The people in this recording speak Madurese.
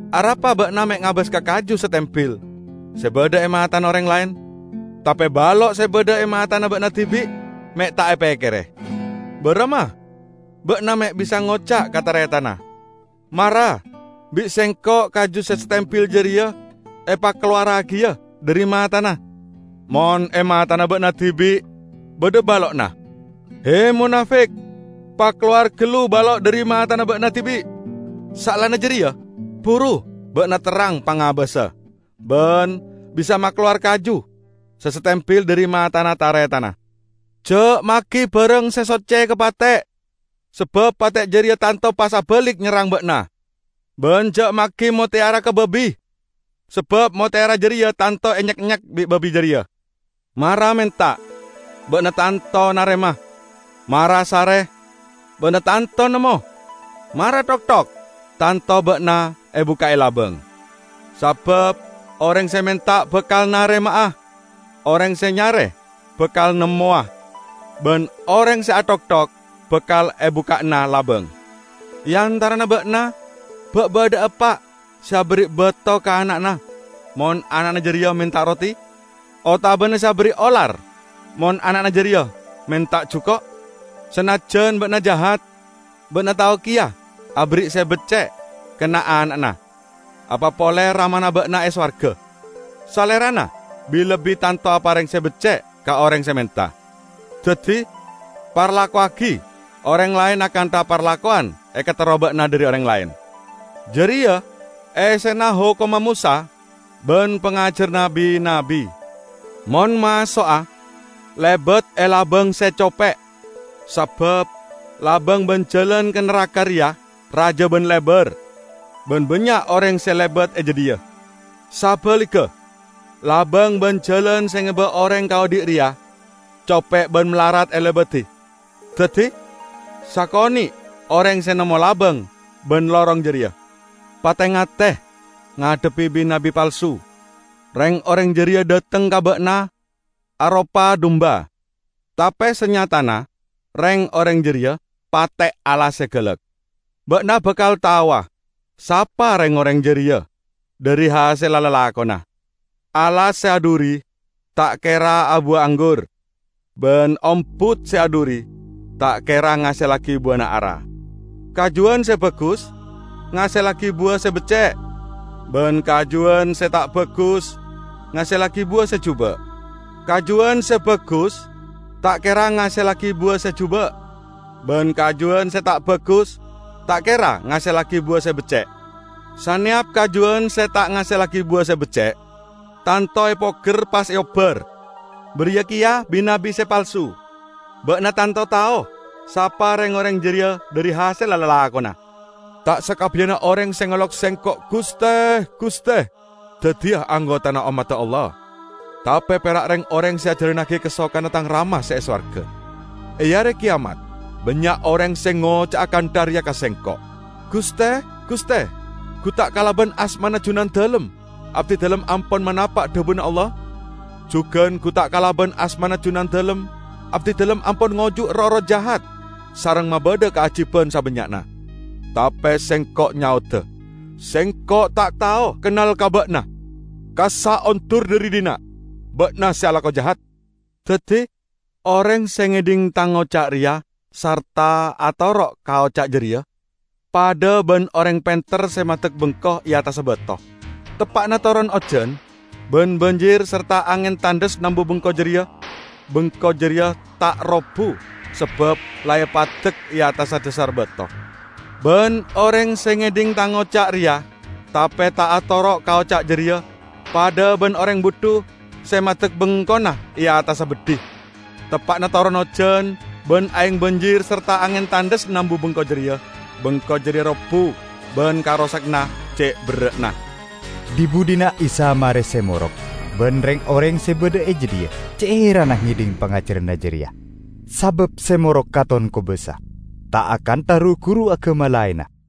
Arapa ba'na me' ngabas ka kaju satembil se badha e matana oreng laen, tape balo' se badha e matana ba'na dibi' me' ta' epekkere? Baramma ba'na me' bisa ngoca' ka taretanna, 'Mara bi' sengko' kaju se satembil jareya epakalowarragiya dhari matana,' mon e matana ba'na dibi' badha balo'na? He, monafik! Pakalowar gallu balo' dhari matana ba'na dibi', saellana jareya buru ba'na terrang pangabassa, ban bisa makalowar kaju se satembil dhari matana taretanna. Ja' magi barang se socce ka pate', sabab pate' jareya tanto pas abalik nyerrang ba'na. Ban ja' magi motteyara ka babi, sabab motteyara jareya tanto enyek-enyek bi' babi jareya." "Mara menta, ba'na tanto narema. Mara sare, ba'na tanto nemmo. Mara thokthok, tanto ba'na ebukka'e labang. Sabab oreng se menta bakal narema'a: oreng se nyare bakal nemmowa; ban oreng se athokthok bakal ebukka'ana labang. E antarana ba'na ba' badha'a eppa' se aberri' bato ka ana'na mon ana'na jareya menta roti? Otabana se aberri' olar mon ana'na jareya menta juko'? Sanajjan ba'na jahat, ba'na tao keya aberri' se becce' ka na'-ana'na. Apa pole Ramana ba'na e sowarga! Salerana bi-lebbi tanto apareng se becce' ka oreng se menta. Daddi parlakowagi oreng laen akantha parlakowan ekaterro ba'na dhari oreng laen. Jareya essena hokomma Mosa ban pangajaranna bi-nabbi." "Mon maso'a, lebat e labang se cope', sabab labang ban jalan ka naraka reya raja ban lebar, ban bannya' oreng se lebat e jadhiya. Sabaligga labang ban jalan se ngeba oreng ka odhi' reya cope' ban malarat elebadi. Daddi sakone' oreng se nemmo labang ban lorong jareya." "Pate-ngate ngadhebbi bi-nabbi palsu. Reng-oreng jareya dhateng ka ba'na aropa dumba, tape sanyatana reng-oreng jareya pate' alas se galak. Ba'na bakal taowa sapa reng-oreng jareya dhari hasella lalakonna. Alas se adhuri ta' kera abuwa anggur, ban ombut se adhuri ta' kera ngasellagi buwana ara. Kajuwan se bagus ngasellagi buwa se becce', ban kajuwan se ta' bagus ngasellagi buwa se juba'. Kajuwan se bagus ta' kera ngasellagi buwa se juba', ban kajuwan se ta' bagus ta' kera ngasellagi buwa se becce'. Saneyap kajuwan se ta' ngasellagi buwa se becce' tanto epoger pas eobbar. Bariya keya bi-nabbi se palsu. Ba'na tanto tao sapa reng-oreng jareya dhari hasella lalakonna." "Ta' sakabbiyanna oreng se ngolok Sengko', 'Guste, Guste,' daddiya anggotana ommadda Allah, tape pera' reng-oreng se ajalannagi kasokanna Tang Rama se e sowarga. E Are Keyamat bannya' oreng se ngoca'a kantha reya ka Sengko', 'Guste, Guste, gu ta' kalaban asmana Junandalem abdidalem ampon manapa' dhabuna Allah? Jugan gu ta' kalaban asmana Junandalem abdidalem ampon ngojuk roh-erroh jahat sareng mabadha kaajiban sabannya'na?' Tape Sengko' nyaoda, 'Sengko' ta' tao kennal ka ba'na! Kassa' ondur dhari dhinna', ba'na se alako jahat!' " "Daddi, oreng se ngedhing Tang oca' reya, sarta atoro' ka oca' jareya, padha ban oreng penter se maddek bengko e attassa bato. Teppa'na toron ojan, ban banjir sarta angen tandhes nambu bengko jareya, bengko jareya ta' robbu sabab la epaddek e attassa dhasar bato. Ban oreng se ngedhing Tang oca' reya, tape ta' atoro' ka oca' jareya, padha ban oreng budhu se maddek bengkona e attassa beddhi. Teppa'na toron ojan, ban aeng banjir sarta angen tandhes nambu bengko jareya, bengko jareya robbu. Ban karosaganna ce' berra'na!" Dhi-budhina Isa mare se morok, ban reng-oreng se badha e jadhiya ce' heranna ngedhing pangajaranna jareya. Sabab se morok katon kobasa, ta' akantha ru-guru agama laenna.